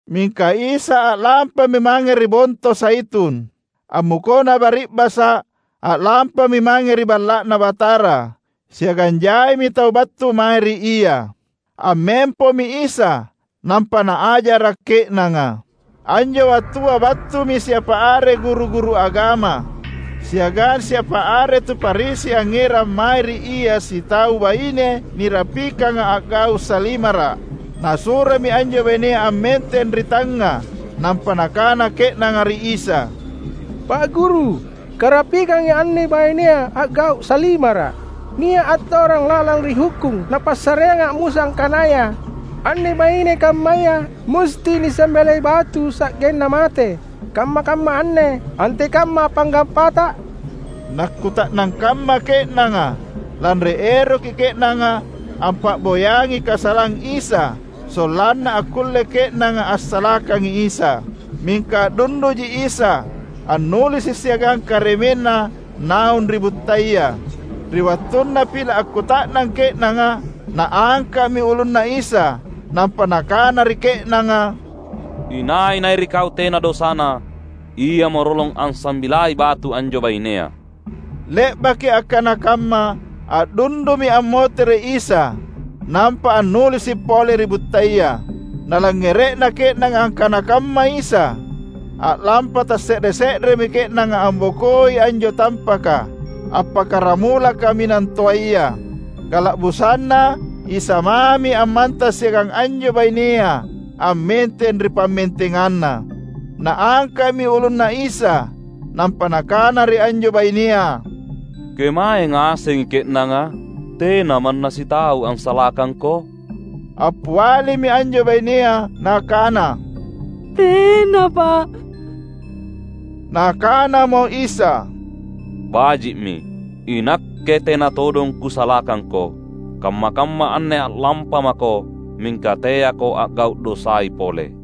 Mingka Isa a’lampami mange ri Bonto Zaitun. Ammukona bari’basa’, a’lampami mange ri Balla’Na Batara, siagang jaimi tau battu mae ri Ia. Ammempomi Isa, nampa Naajara’ ke’nanga. Anjo wattua battumi siapa are guru-guru agama siagang siapa are tu Farisi angngerang mae ri Ia sitau baine nirapikanga a’gau’ salimara’. Nasuromi anjo bainea ammenteng ri tangnga, nampa nakana ke’nanga ri Isa, "Pa’ Guru, karapikangi anne bainea a’gau’ salimara’. Nia’ atorang lalang ri hukkung napassareanga Musa angkanaya, anne baine kammaya musti nisambilai batu sa’genna mate. Kamma-kamma anne, antekamma panggappaTa?" Nakkuta’nang kamma ke’nanga, lanri eroki ke’nanga ampa’boyangi kasalang Isa sollanna akkulle ke’nanga assalakangi Isa. Mingka a’dunduji Isa, annulisi’ siagang karemenNa naung ri buttaya. Ri wattunna pila’ akkuta’nang ke’nanga, Naangka’mi ulunNa Isa nampa Nakana ri ke’nanga, "Inai-nai ri kau tena dosana, iamo rolong ansambilai batu anjo bainea." Le’baki akkana kamma, a’dundumi ammotere’ Isa nampa annulisi’ pole ri buttaya. Nalangngere’na ke’nanga akkana kamma Isa, a’lampa tasse’re-se’remi ke’nanga ambokoi anjo tampaka, appakkaramula kaminang toaya. Kala’busanna Isa mami ammantang siagang anjo bainea ammenteng ri pammentenganna. Naangka’mi ulunNa Isa nampa Nakana ri anjo bainea, "Kemae ngasengi ke’nanga? Tena manna sitau ansalakangko?" Appialimi anjo bainea nakana, "Tena, Pa’." Nakanamo Isa, "Baji’mi; iNakke tena todong Kusalakangko. Kamma-kamma anne a’lampamako, mingka teako a’gau’ dosai pole."]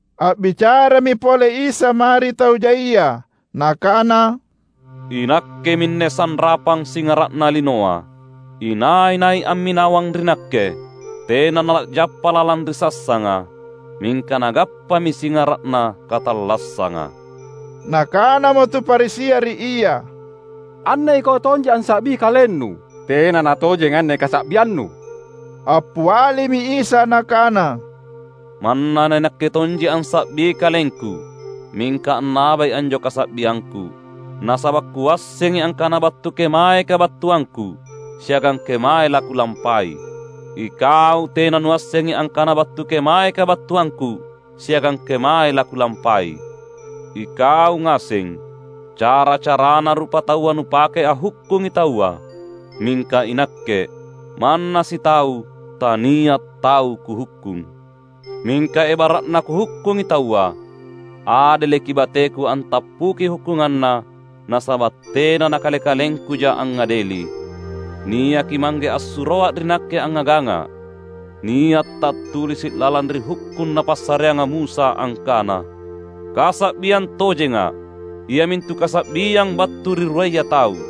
A’bicarami pole Isa mae ri tau jaia, Nakana, "INakke minne sanrapang singara’na linoa. Inai-nai amminawang ri Nakke, tena nala’jappa lalang ri sassanga, mingka nagappami singara’na katallassanga." Nakanamo tu Farisia ri Ia, "Anne iKau tonji ansa’bi KalenNu. Tena natojeng anne kasa’bianNu." Appialimi Isa Nakana, "Manna naiNakke tonji ansa’bi KalengKu, mingka annabai anjo kasa’biangKu; nasaba’ Kuassengi angkana battu kemae kabattuangKu, siagang kemae laKulampai. Ikau tena nuassengi angkana battu kemae kabattuangKu siagang kemae laKulampai. Ikau ngaseng, cara-carana rupataua nupake anghukkungi taua; mingka iNakke, manna sitau tania’ tau Kuhukkung. Mingka ebara’na Kuhukkungi taua, adeleki bateKu antappuki hukkunganna nasaba’ tena naKale-kalengKuja angngadeli. Niaki Mangge assuroA ri Nakke angngagangA’. Nia’ tattulisi’ lalang ri Hukkung napassareanga Musa angkana: Kasa’biang tojenga, iamintu kasa’biang battu ri ruaya tau.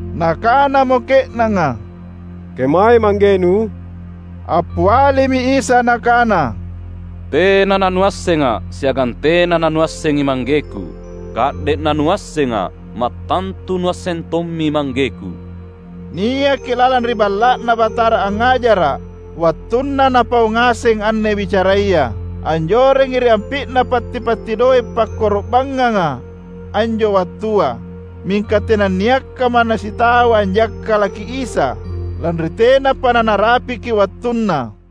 Nakanamo ke’nanga, "Kemae ManggeNu?" Appialimi Isa Nakana, "Tena nanuassengA’ siagang tena nanuassengi ManggeKu. Ka’de’ nanuassengA’, mattantu nuasseng tommi ManggeKu." Niaki lalang ri Balla’Na Batara angngajara’ wattunna Napau ngaseng anne bicaraya. Anjorengi ri ampi’na patti-patti doe’ pakkoro’bangnganga anjo wattua. Mingka tenanniakka manna sitau anjakkalaki Isa, lanri tenapa nanarapiki wattunna.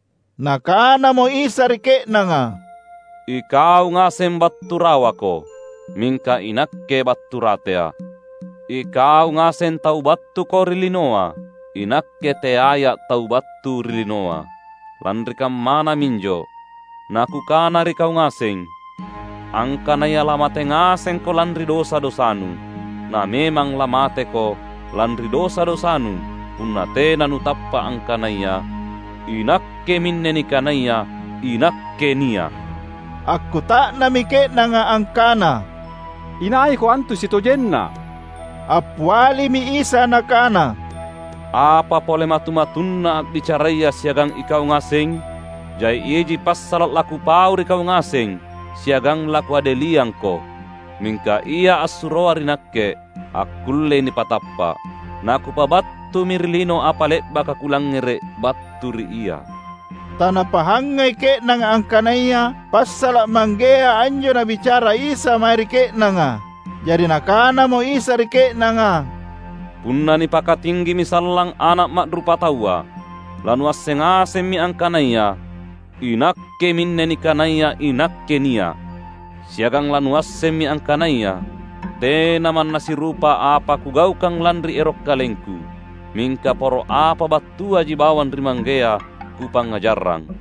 Nakanamo Isa ri ke’nanga, "Ikau ngaseng battu rawako; mingka iNakke battu rateA’. Ikau ngaseng tau battuko ri linoa; iNakke teaiA’ tau battu ri linoa. Lanri kammana minjo naKukana ri kau ngaseng, angkanaya lamate ngasengko lanri dosa-dosanu. Na memang lamateko lanri dosa-dosanu punna tena nutappa’ angkanaya, ‘INakkeminne nikanaya INAKKE NIA’.’" Akkuta’nammi ke’nanga angkana, "InaiKo antu sitojenna?" Appialimi Isa Nakana, "Apa pole matu-matunna a’bicaraya siagang ikau ngaseng? Jai iji passala’ laKupau ri kau ngaseng siagang laKuadeliangko. Mingka Ia assuroA ri Nakke akkullei nipatappa’. Na Kupabattumi ri lino apa le’baka Kulangngere’ battu ri Ia." Tanapahangai ke’nanga angkanaya passala’ Manggea anjo Nabicara Isa mae ri ke’nanga. Jari Nakanamo Isa ri ke’nanga, "Punna nipakatinggimi sallang Ana’ Ma’rupataua, lanuasseng ngasemmi angkanaya, ‘INakkeminne nikanaya INAKKE NIA’.’ Siagang lanuassemmi angkanaya tena manna sirupa apa Kugaukang lanri ero’ KalengKu. Mingka poro apa battuaji bawang ri Manggea Kupangngajarrang.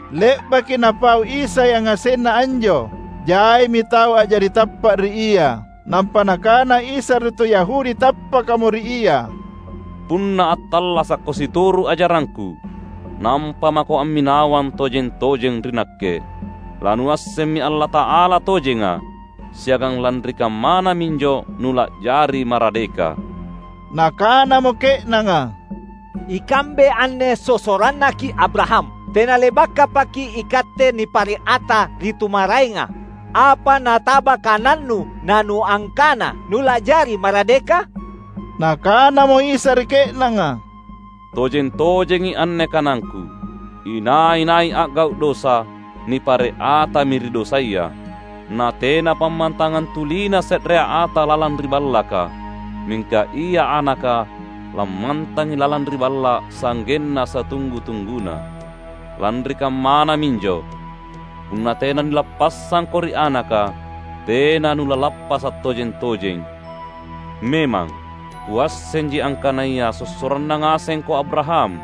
Le’baki Napau Isa yangasenna anjo, jaimi tau a’jari tappa’ ri Ia. Nampa Nakana Isa ri tu Yahudi tappakamo ri Ia, "Punna attallasakko situru’ ajarangKu, nampa mako amminawang tojeng-tojeng ri Nakke; lanuassemmi Allata’ala tojenga, siagang lanri kammana minjo nula’jari maradeka." Nakanamo ke’nanga, "Ikambe anne sossorannaki’ Abraham. Tenale’bakapaki’ ikatte nipare’ ata ri tu maraenga! Apa nataba kananNu naNuangkana, ‘Nula’jari maradeka?’" Nakanamo Isa ri ke’nanga, "Tojeng-tojengi anne kanangKu. Inai-nai a’gau’ dosa, nipare’ atami ri dosaya. Na tena pammantangang tulina se’rea ata lalang ri ballaka; mingka Ia Anaka lammantangi lalang ri balla’ sa’genna satunggu-tungguna. Lanri kammana minjo, punna tena nilappassangko ri Anaka, tena nulalappasa’ tojeng-tojeng. Memang, Kuassenji angkanaya sossoranna ngasengko Abraham.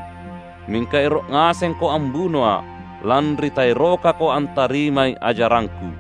Mingka ero’ ngasengko ambunoA’, lanri taerokako antarimai ajarangKu.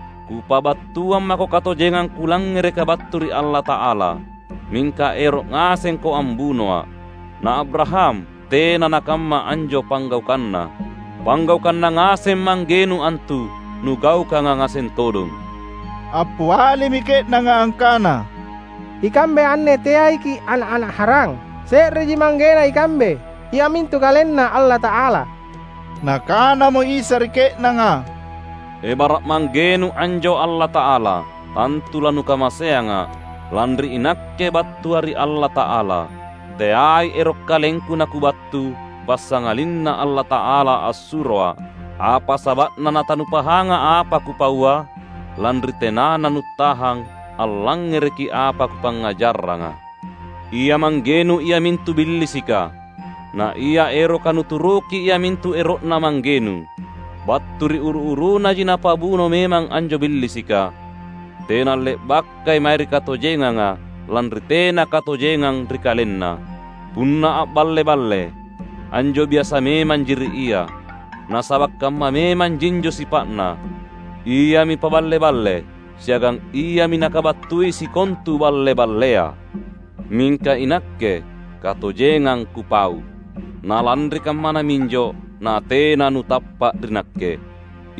Kupabattuang mako katojengang Kulangngereka battu ri Allata’ala, mingka ero’ ngasengko ambunoA’. Na Abraham tena nakamma anjo panggaukanna! Panggaukanna ngaseng manggenu antu nugaukanga ngaseng todong." Appialimi ke’nanga angkana, "Ikambe anne teaiki’ ana’-ana’ harang. Se’reji manggena ikambe, iamintu KalenNa Allata’ala." Nakanamo Isa ri ke’nanga, "Ebara’ manggenu anjo Allata’ala, tantu lanukamaseangA’, lanri iNakke battuA’ ri Allata’ala. Teai ero’ KalengKu naKubattu, passangalinna Allata’ala assuroA’. Apa saba’na natanupahanga apa Kupaua? Lanri tenana nuttahang allangngereki apa Kupangngajaranga. Ia manggenu iamintu Billisika, naia eroka nuturuki iamintu ero’na manggenu. Battu ri uru-urunaji napabuno memang anjo Billisika. Tena le’bakai mae ri katojenganga, lanri tena katojengang ri kalenna. Punna a’balle-balle, anjo biasa memanji ri ia, nasaba’ kamma memanjinjo sipa’na. Iami paballe-balle, siagang iami nakabattui sikontu balle-ballea. Mingka iNakke katojengang Kupau, na lanri kammana minjo natena nutappa’ ri Nakke.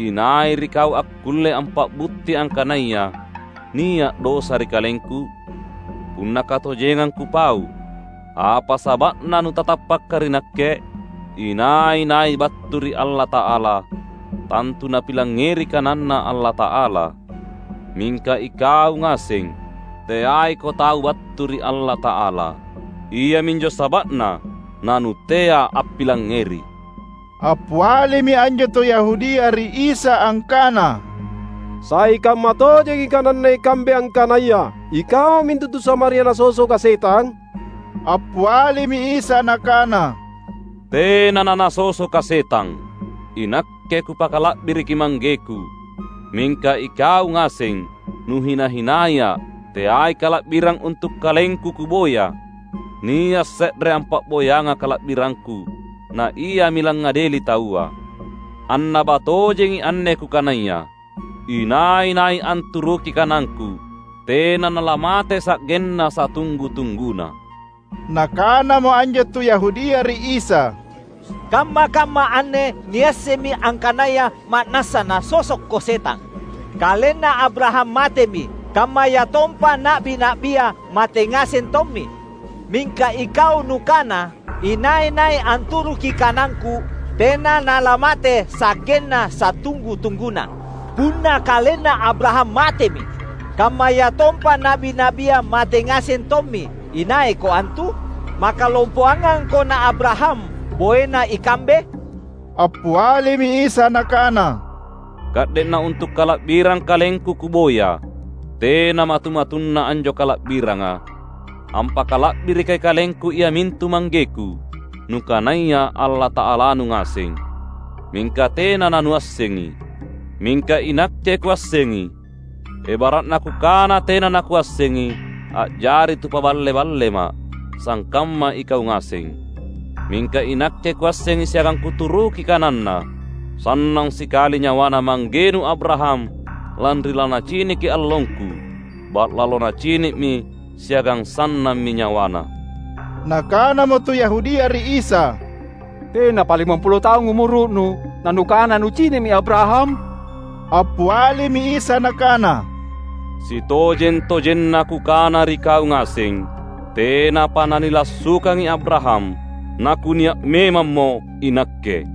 Inai ri kau akkulle ampa’butti angkanaya nia’ dosa ri KalengKu? Punna katojengang Kupau, apa saba’na nutatappaka ri Nakke? Inai-nai battu ri Allata’ala, tantu napilangngeri kananNa Allata’ala. Mingka ikau ngaseng, teaiko tau battu ri Allata’ala. Iaminjo saba’na nanutea appilangngeri." Appialimi anjo tu Yahudia ri Isa angkana, "Sai kammatojengi kananna ikambe angkanaya ikau mintu tu Samaria nasosoka setang?" Appialimi Isa Nakana, "Tena nanasosoKa’ setang. INakke Kupakala’biriki ManggeKu, mingka ikau ngaseng nuhina-hinaiA’. Teai kala’birang untu’ KalengKu Kuboya. Nia’ se’re ampa’boyangA’ kala’birangKu, na Iami langngadeli taua. Annaba tojengi anne Kukanaya: inai-nai anturuki kanangKu tena nalamate sa’genna satunggu-tungguna." Nakanamo anjo tu Yahudia ri Isa, "Kamma-kamma anne niassemmi angkanaya ma’nassa nasosokKo setang! Kalenna Abraham matemi, kammayatompa na’bi-na’bia mate ngaseng tommi. Mingka iKau Nukana, ‘Inai-nai anturuki kanangKu, tena nalamate sa’genna satunggu-tungguna.’ Punna kalenna Abraham matemi, kammayatompa na’bi-na’bia mate ngaseng tommi, inaiKo antu? Maka lompongangKo na Abraham boena ikambe?" Appialimi Isa Nakana, "Ka’de’ nauntu’ kala’birang KalengKu Kuboya, tena matu-matunna anjo kala’biranga. Ampakala’birikai KalengKu iamintu ManggeKu, nukanaya Allata’alanu ngaseng, mingka tena nanuassengi. Mingka iNakke Kuassengi. Ebara’na Kukana tena naKuassengi, a’jari tu paballe-balleMa’, sangkamma ikau ngaseng. Mingka iNakke Kuassengi siagang Kuturuki kananNa. Sannang sikali nyawana manggenu Abraham lanri lanaciniki allongKu. Ba’lalo nacini’mi siagang sannammi nyawana!" Nakanamo tu Yahudia ri Isa, "Tenapa limampulo taung umuru’Nu, na Nukana Nucini’mi Abraham?" Appialimi Isa Nakana, "Sitojeng-tojenna Kukana ri kau ngaseng: tenapa nanilassukangi Abraham, naKunia’ memammo iNakke."